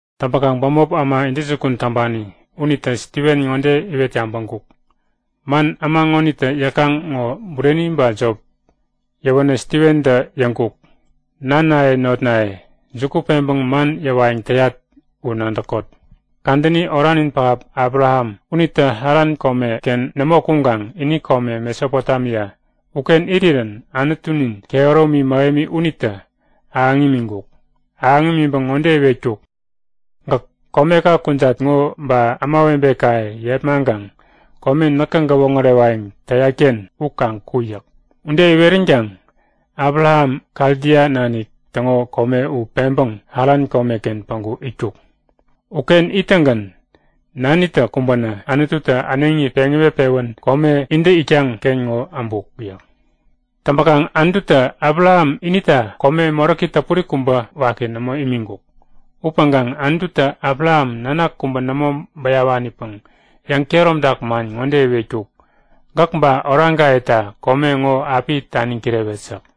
Täŋpäkaŋ bämop äma intäjukun täŋpani unitä Stiven ŋode iwet yabäŋkuk; Man äma ŋonitä yäkaŋ ŋo bureni ba jop? Yäwänä Stiventä yäŋkuk; Nanaye notnaye, juku peŋpäŋ man yäwayäŋ täyat u nadäkot; Kadäni oranin pähap Abraham unitä Haran komeken nämo kuŋkaŋ ini komen Mesopotemia uken irirän Anutunin kehäromi mähemi unitä ahäŋ imiŋkuk. Ahäŋ imiŋpäŋ ŋode iwetkuk; Gäk komeka kujat ŋo ba ämawebekaye yepmaŋkaŋ kome näkä gäwoŋärewayäŋ täyat-ken u kaŋ ku yäk. Ude iweränkaŋ Abraham Kaldia nanik täŋo kome u peŋpäŋ Haran komeken päŋku itkuk. Uken ittäŋgän nanitä kumbänä Anututä äneŋi peŋ iwet-pewän kome intä itkaŋ-ken ŋo äbuk yäk. Täŋpäkaŋ Anututä Abraham inita kome moräki täpuri kubä waki nämo imiŋkuk. Upäŋkaŋ Anututä Abraham nanak kubä nämo bäyawanipäŋ yäŋkehäromtak man ŋode iwetkuk; Gäk ba oraŋkayeta kome ŋo api taniŋ kirewet yäk.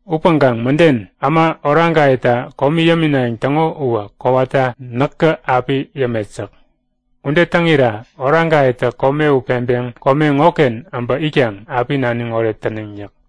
Upäŋkaŋ mäden, äma oraŋkayeta komi yäminayäŋ täŋo uwä kowata näkä api yämet yäk. Ude täŋira oraŋkayetä kome u peŋpeŋ kome ŋoken äbä itkaŋ api naniŋ oret täneŋ yäk.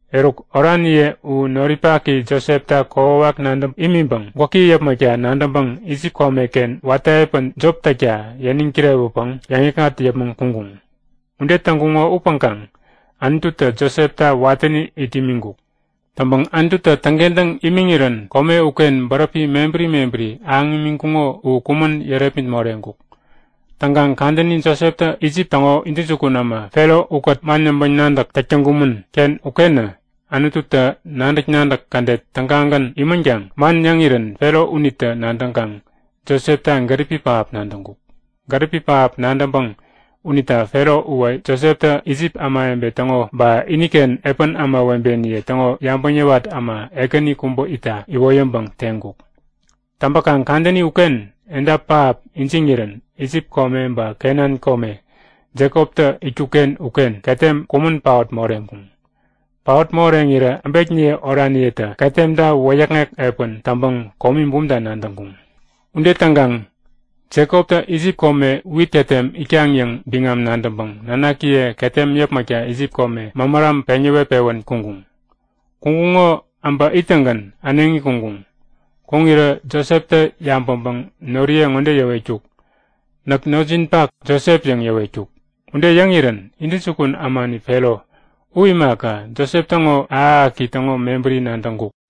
Eruk, oraniye u noripaki Josepta kokwawak nadäŋ imiŋpäŋ gwäki yäpmäkta nadäŋpäŋ Isip komeken watä epän jop täkta yäniŋ kirewäpäŋ yäŋikŋat yäpmäŋ kuŋkuŋ. Ude täŋkuŋo upäŋkaŋ Anututä Josepta watäni it imiŋkuk. Täŋpäŋ Anututä täŋkentäŋ imiŋirän kome uken bäräpi mebäri mebäri ahäŋ imiŋkuŋo u kumän yärepmit moreŋkuk. Täŋkaŋ kadäni Joseptä Isip täŋo intäjukun äma Fero ukät man yäŋpäŋ-nadäk täk täŋkumän-ken ukenä Anututä nadäk-nadäk kädet tägagän imänkaŋ man yäŋirän Fero unitä nadäŋkaŋ Josepta gäripi pähap nadäŋkuk. Gäripi pähap nadäŋpäŋ unita Fero uwä Joseptä Isip ämawebe täŋo ba iniken epän ämawebeniye täŋo yabäŋ yäwat äma ekäni kubä itta iwoyäŋpäŋ teŋkuk. Täŋpäkaŋ kadäni uken edap pähap ijiŋirän Isip kome ba Kenan kome Jekoptä itkuk-ken uken ketem kumän paot moreŋkuŋ. Paot moreŋirä äbekniye oraniyetä ketemta wäyäkŋek epän täŋpäŋ komi bumta nadäŋkuŋ. Ude täŋkaŋ Jekoptä Isip kome wit ketem itkaŋ yäŋ biŋam nadäŋpäŋ nanakiye ketem yäpmäkta Isip kome mämäram peŋ yäwet-pewän kuŋkuŋ. Kuŋkuŋo äbä ittäŋgän äneŋi kuŋkuŋ. Kuŋirä Joseptä yabäŋpäŋ noriye ŋode yäwetkuk; Näk notjinpak Josep yäŋ yäwetkuk. Ude yäŋirän intäjukun ämani Fero u imaka, Josep täŋo ahäk-ahäki täŋo mebäri nadäŋkuk.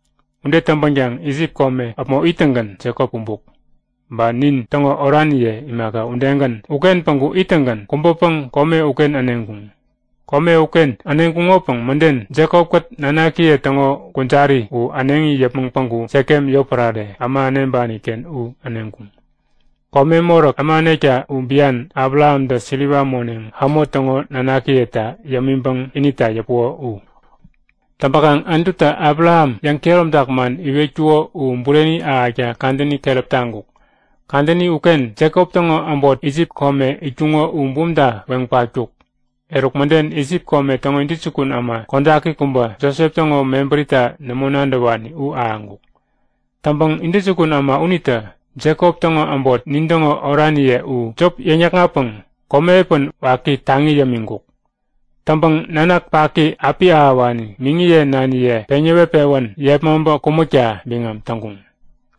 Ude täŋpänkaŋ Isip kome äpmo ittäŋgän Jekop kumbuk. Ba nintäŋo oraniye imaka udegän uken päŋku ittäŋgän kubäpäŋ kome uken äneŋkuŋ. Kome uken äneŋkuŋopäŋ mäden Jekop-kät nanakiye täŋo kujari u äneŋi yäpmäŋ päŋku Sekem yotpärare, äma äneŋpani-ken u äneŋkuŋ. (Kome moräk, äma änekta u bian, Abrahamtä siliwa moneŋ Hamo täŋo nanakiyeta yämiŋpäŋ inita yäpuko u.) Täŋpäkaŋ Anututä Abraham yäŋkehäromtak man iwetkuko u bureni ahäkta kadäni keräp taŋkuk. Kadäni uken Jekop täŋo äbot Isip kome itkuŋo u bumta weŋ patkuk. Eruk mäden Isip kome täŋo intäjukun äma kodaki kubä, Josep täŋo mebärita nämo nadäwani u ahäŋkuk. Täŋpäŋ intäjukun äma unitä Jekop täŋo äbot, nintäŋo oraniye u, jop yäkŋatpäŋ komi epän waki taŋi yämiŋkuk. Täŋpäŋ nanak paki api ahäwani miŋiye naniye peŋ yäwet-pewän yepmaŋpä kumäkta biŋam täŋkuŋ.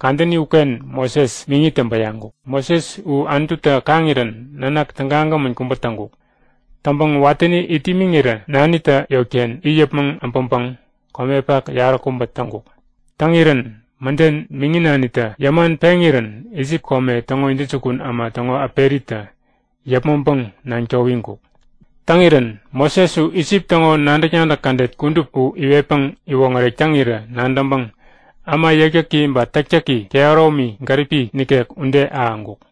Kadäni uken Moses, miŋitä bäyaŋkuk. Moses u Anututä kaŋirän nanak tägagämän kubä täŋkuk. Täŋpäŋ watäni it imiŋirä nanitä yotken it yäpmäŋ äbäŋpäŋ komepak yaräkubä täŋkuk. Täŋirän mäden miŋi nanitä yäman peŋirän Isip kome täŋo intäjukun äma täŋo äperitä yäpmäŋpäŋ naŋ towiŋkuk. Täŋirän Moses u Isip täŋo nadäk-nadäk kädet kudup u iwetpäŋ iwoŋärek täŋirä nadäŋpäŋ äma yäkyäki ba täktäki kehäromi, gäripi nikek ude ahäŋkuk.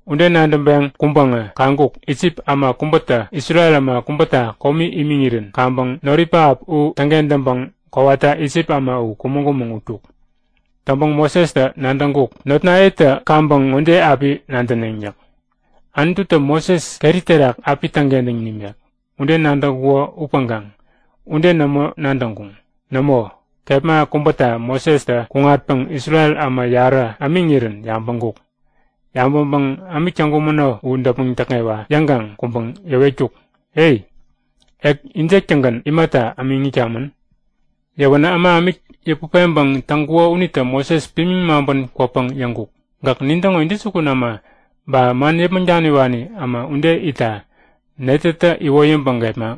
Ude nadäŋpeŋ kuŋpäŋä kaŋkuk; Isip äma kubätä Isrel äma kubäta komi imiŋirän kaŋpäŋ noripähap u täŋkentäŋpäŋ kowata Isip äma u kumäŋ-kumäŋ utkuk. Täŋpäŋ Mosestä nadäŋkuk; Notnayetä kaŋpäŋ ŋode api nadäneŋ yäk; Anututä Moses keri terak api täŋkentäŋ nimek. Ude nadäŋkuko upäŋkaŋ ude nämo nadäŋkuŋ. Nämo, kepma kubäta Mosestä kuŋatpäŋ Isrel äma yarä ämiŋirän yabäŋkuk. Yabäŋpäŋ ämik täŋkumäno u däpmäŋ täkŋewa yäŋkaŋ kuŋpäŋ yäwetkuk; E! Ek injek-tägän imata ämiŋ itkamän? Yäwänä äma ämik yäput peŋpäŋ täŋkuko unitä Moses pimiŋ maŋpän kwäpäŋ yäŋkuk; Gäk nintäŋo intäjukun äma ba man yäpmäŋ daniwani äma ude itta netätä iwoyäŋpäŋ gepmak?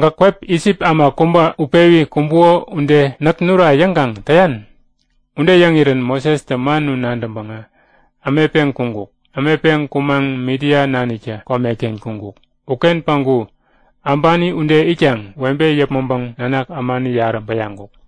Gäk kwep Isip äma kubä utpewi kumbuko ude näk nura yäŋkaŋ täyan? Ude yäŋirän Mosestä man u nadäŋpäŋä ämetpeŋ kuŋkuk. Ämetpeŋ kumaŋ Midia naniktä komeken kuŋkuk. Uken päŋku äbani ude itkaŋ webe yäpmäŋpäŋ nanak ämani yarä bäyaŋkuk.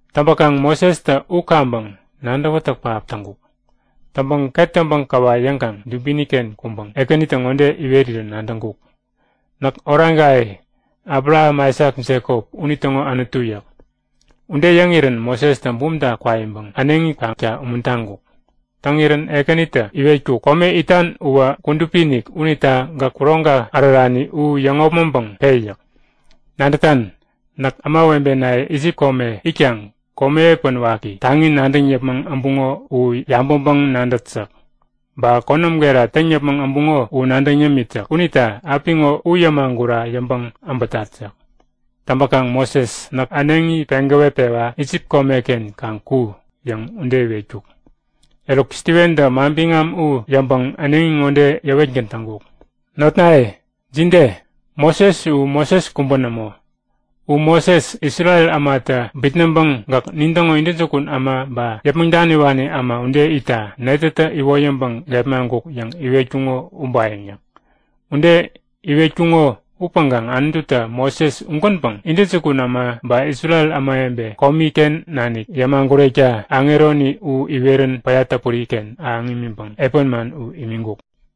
Täŋpäkaŋ Mosestä u kaŋpäŋ nadäwätäk pähap täŋkuk. Täŋpäŋ ket täŋpäŋ käwa yäŋkaŋ dubini-ken kuŋpäŋ Ekänitä ŋode iwerirän nadäŋkuk; Näk oraŋkaye Abraham Aisak Jekop, unitäŋo Anutu yäk. Ude yäŋirän Mosestä bumta kwaiŋpäŋ äneŋi kakta umuntaŋkuk. Täŋirän Ekänitä iwetkuk; Kome itan uwä kudupi-inik unita gäk kuroŋka ärärani u yäŋopmäŋpäŋ pe yäk. Nadätan? Näk ämawebenaye Isip kome itkaŋ komi epän waki taŋi nadäŋ yäpmäŋ äbuŋo u yabäŋpäŋ-nadät yäk. Ba konäm gera täŋ yäpmäŋ äbuŋo u nadäŋ yämit yäk. Unita apiŋo u yämagura yäŋpäŋ äpätat yäk. Täŋpäkaŋ Moses, näk äneŋi peŋ gäwetpewa Isip komeken kaŋ ku yäŋ, ude iwetkuk. Eruk Stiventä manbiŋam u yäŋpäŋ äneŋi ŋode yäwetgän täŋkuk; Notnaye, jide? Moses u Moses kubä nämo. U Moses, Isrel ämatä bitnäŋpäŋ Gäk nintäŋo intäjukun äma ba yäpmäŋ daniwani äma ude itta netätä iwoyäŋpäŋ gepmaŋkuk yäŋ iwetkuŋo ubayäŋ yäk. Ude iwetkuŋo upäŋkaŋ Anututä Moses ugänpäŋ intäjukun äma ba Isrel ämawebe komi-ken nanik yämagurekta aŋeroni iwerän päya täpuri-ken ahäŋ imiŋpäŋ epän man u imiŋkuk.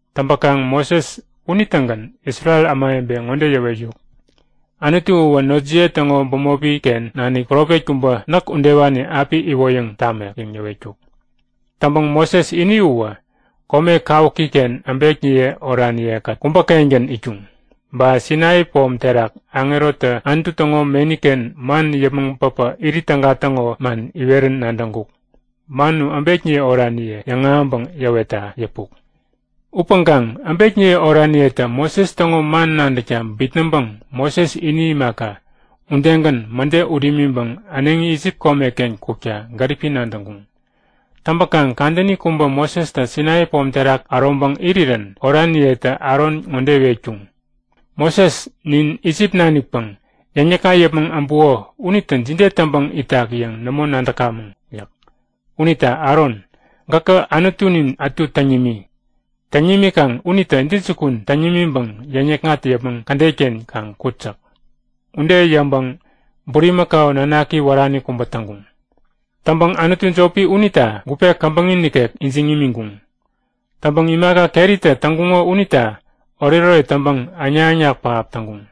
Täŋpäkaŋ Moses unitägän Isrel ämawebe ŋode yäwetkuk; Anutu uwä notjiye täŋo bämopi-ken nanik profet kubä näk udewani api iwoyäŋ tamek yäŋ yäwetkuk. Täŋpäŋ Moses ini uwä kome kawuki-ken äbekniye oraniye-kät kubä-kengän itkuŋ. Ba Sainai pom terak aŋerotä Anutu täŋo meni-ken man yäpmäŋ päbä irit täga täŋo man iwerän nadäŋkuk. Man u äbekniye oraniye yäŋahäŋpäŋ yäwetta yäpuk. Upäŋkaŋ äbekniye oraniyetä Moses täŋo man nadäkta bitnäŋpäŋ Moses ini imaka, udegän mäde ut imiŋpäŋ äneŋi Isip komeken kukta gäripi nadäŋkuŋ. Täŋpäkaŋ kadäni kubä Mosestä Sainai pom terak äroŋpäŋ irirän oraniyetä Aron ŋode iwetkuŋ; Moses nin Isip nanikpäŋ yäŋnikŋat yäpmäŋ äbuko unitä jide täŋpäŋ itak yäŋ nämo nadäkamäŋ yäk. Unita Aron, gäkä anutunin ätu täŋ nimi. Täŋ nimikaŋ unitä intäjukun täŋ nimiŋpäŋ yäŋnikŋat yäpmäŋ kädet-ken kaŋ kut yäk. Ude yäŋpäŋ bulimakau nanaki wärani kubä täŋkuŋ. Täŋpäŋ anutu jopi unita gupe käbäŋi nikek ijiŋ imiŋkuŋ. Täŋpäŋ imaka keritä täŋkuŋo unita oretoret täŋpäŋ äŋnak-äŋnak pähap täŋkuŋ.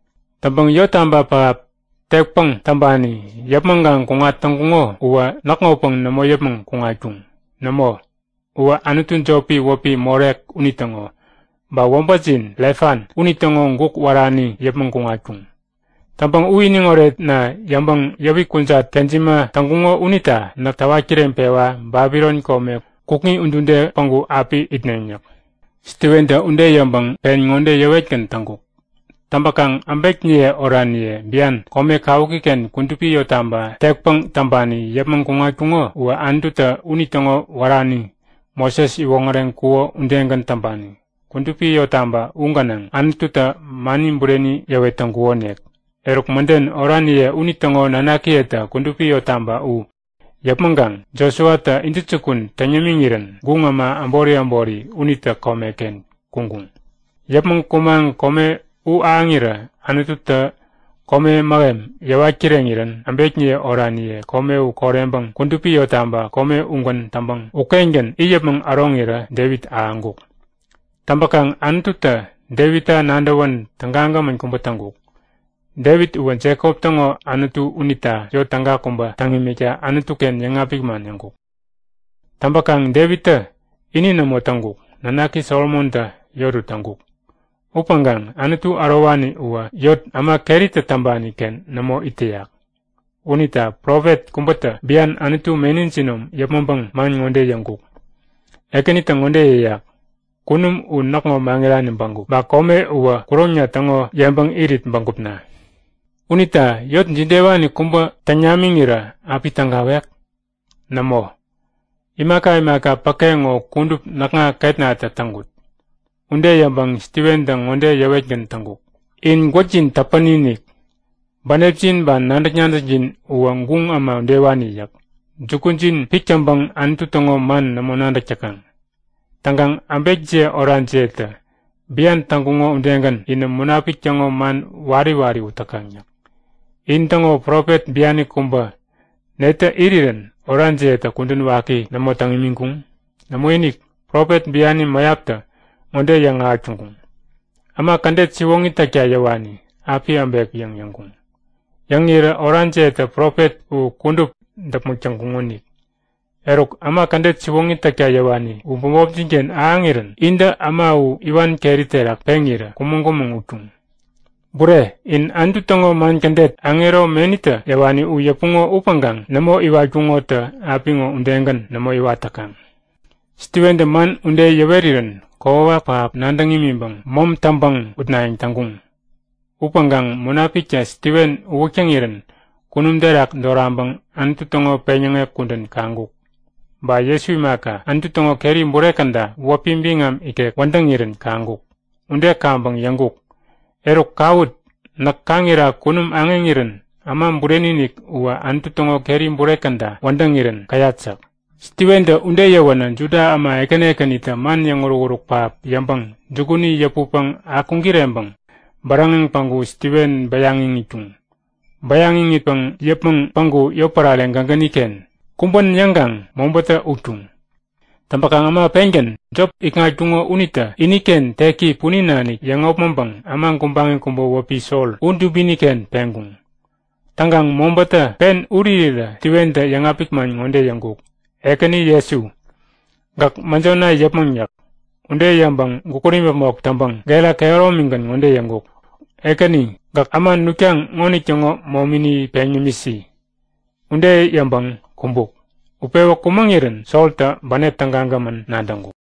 Täŋpäŋ yottaba pähap tekpäŋ täŋpani yäpmäŋkaŋ kuŋat täŋkuŋo uwä näkŋopäŋ nämo yäpmäŋ kuŋatkuŋ. Nämo, uwä anutu jopi wäpi Molek unitäŋo. Ba wäbätjin Refan unitäŋo guk wärani yäpmäŋ kuŋatkuŋ. Täŋpäŋ u iniŋ oretna yäŋpäŋ yäwik kujat kejima täŋkuŋo unita näk täwat kireŋpewa Babilon kome kukŋi udude päŋku api itneŋ yäk. Stiventä ude yäŋpäŋ pen ŋode yäwetgän täŋkuk; Täŋpäkaŋ äbekniye oraniye bian, kome kawuki-ken kudupi yottaba tekpäŋ täŋpani yäpmäŋ kuŋatkuŋo uwä Anututä unitäŋo wärani Moses iwoŋäreŋkuko udegän täŋpani. Kudupi yottaba u gänaŋ Anututä mani bureni yäwet täŋkukonik. Eruk mäden oraniye unitäŋo nanakiyetä kudupi yottaba u yäpmäŋkaŋ Josuatä intäjukun täŋ yämiŋirän guŋ äma äbori äbori unitä komeken kuŋkuŋ. Yäpmäŋ kumaŋ kome u ahäŋirä Anututä kome mähem yäwat kireŋirän äbekniye oraniye kome u koreŋpäŋ kudupi yottaba kome ugän täŋpäŋ ukengän it yäpmäŋ äroŋirä Devit ahäŋkuk. Täŋpäkaŋ Anututä Devitta nadäwän tägagämän kubä täŋkuk. Devit uwä Jekop täŋo Anutu unita yot täga kubä täŋ imikta Anutu-ken yäŋapik man yäŋkuk. Täŋpäkaŋ Devittä ini nämo täŋkuk. Nanaki Solomontä yot u täŋkuk. Upäŋkaŋ Anutu Ärowani uwä yot äma keritä täŋpani-ken nämo it täyak. Unita profet kubätä bian Anutu meni jinom yäpmäŋpäŋ man ŋode yäŋkuk; Ekänitä ŋode yäyak; Kunum u näkŋo maŋirani bägup. Ba kome uwä kuroŋna täŋo yeŋpäŋ irit bägupna. Unita yot jidewani kubä täŋ namiŋirä api tägawek? Nämo! Imaka imaka päke ŋo kudup näkŋa ketnatä täŋkut. Ude yäŋpäŋ Stiventä ŋode yäwetgän täŋkuk; In gwäkjin täpäni-inik! Bänepjin ba nadäk-nadäkjin uwä guŋ äma udewani yäk. Jukujin pik täŋpäŋ Anutu täŋo man nämo nadäk täkaŋ. Täŋkaŋ äbekjiye orajiyetä bian täŋkuŋo udegän inä Munapik täŋo man wari wari ut täkaŋ yäk. In täŋo profet biani kubä netä irirän orajiyetä kudän waki nämo täŋ imiŋkuŋ? Nämoinik! Profet biani mäyaptä ŋode yäŋahäk täŋkuŋ; Äma kädet siwoŋi täkta yäwani api äbek yäŋ yäŋkuŋ. Yäŋirä orajiyetä profet u kudup däpmäk täŋkuŋonik. Eruk, äma kädet siwoŋi täkta yäwani u bämopjin-ken ahäŋirän intä äma u iwan keri terak peŋirä kumäŋ-kumäŋ utkuŋ. Bure, inä Anutu täŋo man kädet, aŋero menitä yäwani u yäpuŋo upäŋkaŋ nämo iwatkuŋotä apiŋo udegän nämo iwat täkaŋ. Stiventä man ude yäwerirän kokwawak pähap nadäŋ imiŋpäŋ mäm täŋpäŋ utnayäŋ täŋkuŋ. Upäŋkaŋ Munapiktä Stiven uwäk täŋirän kunum terak doraŋpäŋ Anutu täŋo peŋyäŋek kudän kaŋkuk. Ba Jesu imaka, Anutu täŋo keri bure käda wäpi biŋam ikek wädäŋirän kaŋkuk. Ude kaŋpäŋ yäŋkuk; Eruk kawut! Näk kaŋira kunum aŋeŋirän Äma Bureni-inik uwä Anutu täŋo keri bure käda wädäŋirän käyat yäk. Stiventä ude yäwänä Juda äma ekäni ekänitä man yäŋuruk-uruk pähap yäŋpäŋ jukuni yäputpäŋ akuŋ-kireŋpäŋ bäräŋeŋ päŋku Stiven bäyaŋ iŋitkuŋ. Bäyaŋ iŋitpäŋ yäpmäŋ päŋku yotpärare gägäni-ken kumbän yäŋkaŋ mobätä utkuŋ. Täŋpäkaŋ äma pengän jop ikŋatkuŋo unitä iniken teki punin nanik yäŋopmäŋpäŋ äma gubaŋi kubä wäpi Sol u dubini-ken peŋkuŋ. Täŋkaŋ mobätä pen ut irirä Stiventä yäŋapik man ŋode yäŋkuk; Ekäni Jesu, gäk mäjona yäpmäŋ yäk. Ude yäŋpäŋ gukut imäpmok täŋpäŋ gera kehäromigän ŋode yäŋkuk; Ekäni, gäk äma nutkaŋ ŋonitäŋo momini peŋ yämisi. Ude yäŋpäŋ kumbuk. Utpewä kumäŋirän Soltä bänep tägagämän nadäŋkuk.